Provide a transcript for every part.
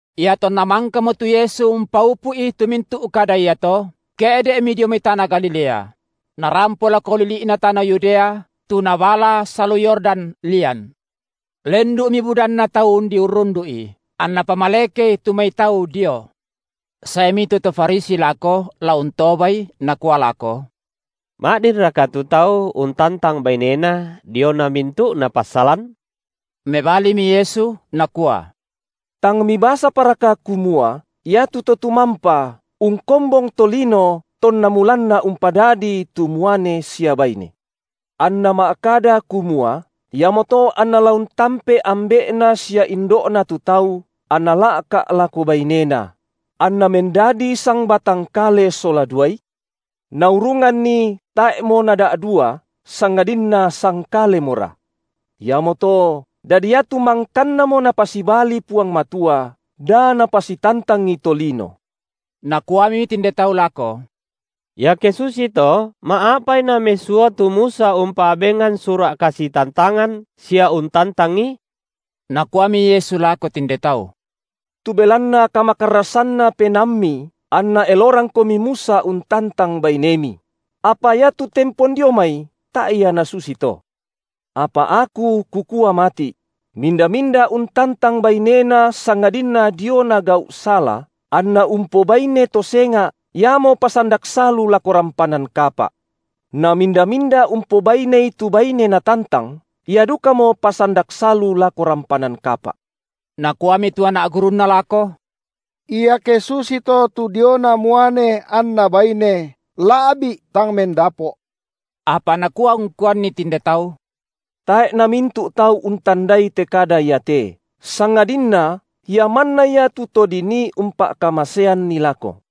Iatonna mangkamo tu Yesu umpaupu’i tu mintu’ kada iato, ke’de’Mi dio mai tana Galilea; Narampo lako lili’na tana Yudea, tu nabala salu Yordan lian. Lendu’mi budanna tau undi urrundu’I, anNa pamalekei tu mai tau dio. Saemi tu to Farisi lako la untobaI nakua lako: Ma’dinraka tu tau untantang bainena diona mintu’na passalan? Mebalimi Yesu, Nakua: Tang mibasaparaka kumua Ia tu Totumampa ungkombong tolino tonna mulanna umpadadii tu muane sia baine. Anna ma’kada kumua: Iamoto anna la untampe ambe’na sia indo’na tu tau anna la’ka’ lako bainena; anna mendadi sangbatang kale sola duai? Naurunganni tae’mo nada’dua sangadinna sangkalemora. Iamoto, dadi iatu mangkannamo Napasibali Puang Matua, da napasitantangi tolino. Nakuami tinde tau lako: Iake susito, ma’apai namesua tu Musa umpa’bengan sura’ kasitantangan sia untantangi? Nakuami Yesu lako tinde tau: Tu belanna kamakarrasanna penaammi anna elorangkomi Musa untantang bainemi; apa iatu tempon dio mai tae’ ia nasusito. Apa Aku Kukua mati’: minda-minda untantang bainena sangadinna diona gau’ sala, anna umpobaine to senga’, iamo pasandak salu lako rampanan kapa’. Na minda-minda umpobainei tu baine natantang, ia dukamo pasandak salu lako rampanan kapa’. Nakuami tu anak gurunNa lako: Iake susito tu diona muane anna baine, la’bi’ tang mendapo’. Apa Nakua ungkuanni tinde tau: Tae’ namintu’ tau untandai te kada iate, sangadinna ia manna ia tu to dinii umpa’kamaseanni lako.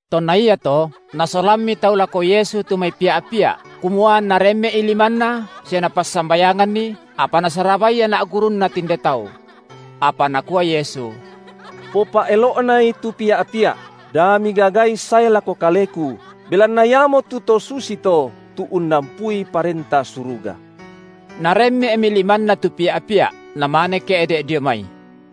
Tonna iato nasolammi tau lako Yesu tu mai pia’-pia’, kumua anNa remme’i limanNa sia Napassambayanganni, apa nasarabai anak gurunNa tinde tau. Apa Nakua Yesu: Popa’elo’nai tu pia’-pia’, da migagai sae lako Kaleku, belanna iamotu to susito tu unnampui Parenta Suruga. Naremme’mi limanNa tu pia’-pia’, Namane ke’de’ dio mai.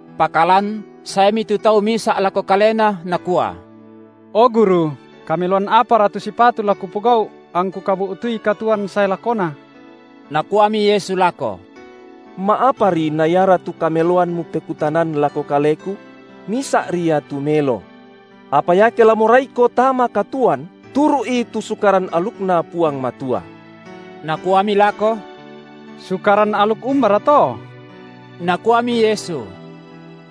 Pakalan saemi tu tau misa’ lako Kalena nakua: O Guru, kameloan apara tu sipatu la kupogau’, angku kabu’tui katuoan sae lakona? Nakuami Yesu lako: Ma’apari na iara tu kameloan mupekutanan lako Kaleku? Misa’ri Ia tu melo. Apa iake la moraiko tama katuoan, turu’i tu Sukaran alukNa Puang Matua. Nakuami lako: Sukaran aluk umbara to? Nakuami Yesu: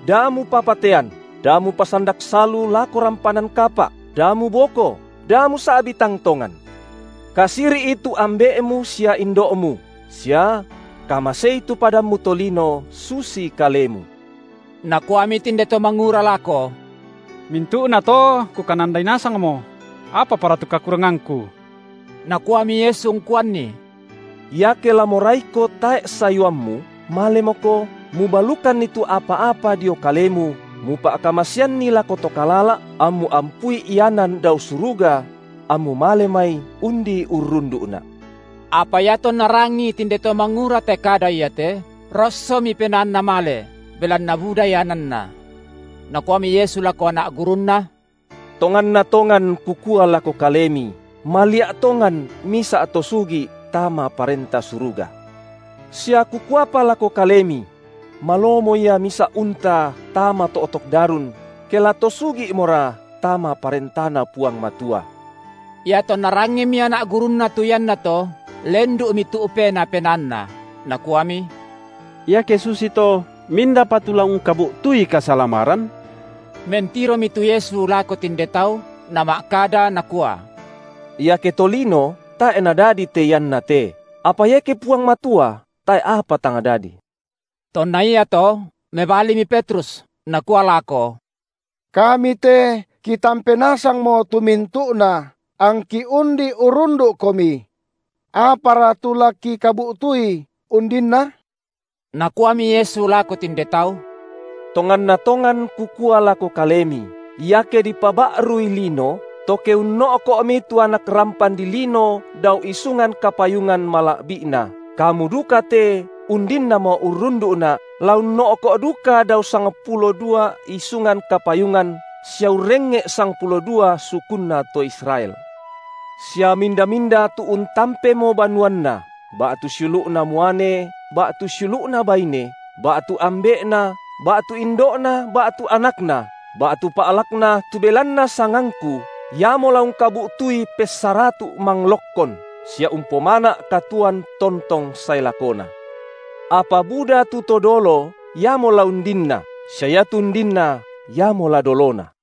Da mupapatean, da mupasandak salu lako rampanan kapa’, da muboko, da musa’bi tang tongan. Kasiri’i tu ambe’mu sia indo’mu, sia: Kamasei tu padammu tolino susi kalemu. Nakuami tinde to mangura lako: Mintu’na to kukanandai nasangmo; apapara tu kakurangangku? Nakuami Yesu ungkuanni: Iake la moraiko tae’ sayuammu, malemoko, mubalukanni tu apa-apa dio kalemu, mupa’kamaseanni lako to kalala’, ammu ampui ianan dao suruga; ammu male mai undi urrundu’Na’. Apa iatonna rangii tinde to mangura te kada iate, rossomi penaanna male, belanna buda iananna. Nakuami Yesu lako anak gurunNa: Tonganna tongan Kukua lako kalemi, malia’ tongan misa’ to sugi’ tama Parenta Suruga. Sia Kukuapa lako kalemi: Malomo ia misa’ unta tama to’tok darun ke la to sugi’mora tama Parentana Puang Matua. Iatonna rangimi anak gurunNa tu iannato, lendu’mi tu’pena penaanna, nakuami: Iake susito, mindapa tu la ungkabu’tui kasalamaran? Mentiromi tu Yesu lako tinde tau Nama’kada, Nakua: Iake tolino tae’ nadadi te iannate, apa iake Puang Matua tae’ apa tang dadi. Tonna iato mebalimi Petrus, nakua lako: Kami te kitampe nasangmo tu mintu’na, angki undi urrundu’Komi. Apara tu la kikabu’tui undinna? Nakuami Yesu lako tinde tau: Tonganna tongan Kukua lako kalemi, iake dipaba’rui lino, to ke unno’ko’mi tu Anak rampan dilino dao isungan kapayungan mala’bi’Na, kamu duka te undinnamo urrundu’Na’, la unno’ko’ duka dao sangpulo dua isungan kapayungan sia urrengnge’ sangpulo dua sukunna to Israel. Sia minda-minda tu untampemo banuanna, ba’tu siulu’na muane ba’tu siulu’na baine, ba’tu ambe’na ba’tu indo’na ba’tu anakna, batu pa’lakna tu belanna sangangKu, iamo la ungkabu’tui pessaratu’ manglokkon, sia umpomana’ katuoan tontong sae lakona. Apa buda tu to dolo iamo la undinna, sia iatu undinna iamo la dolona.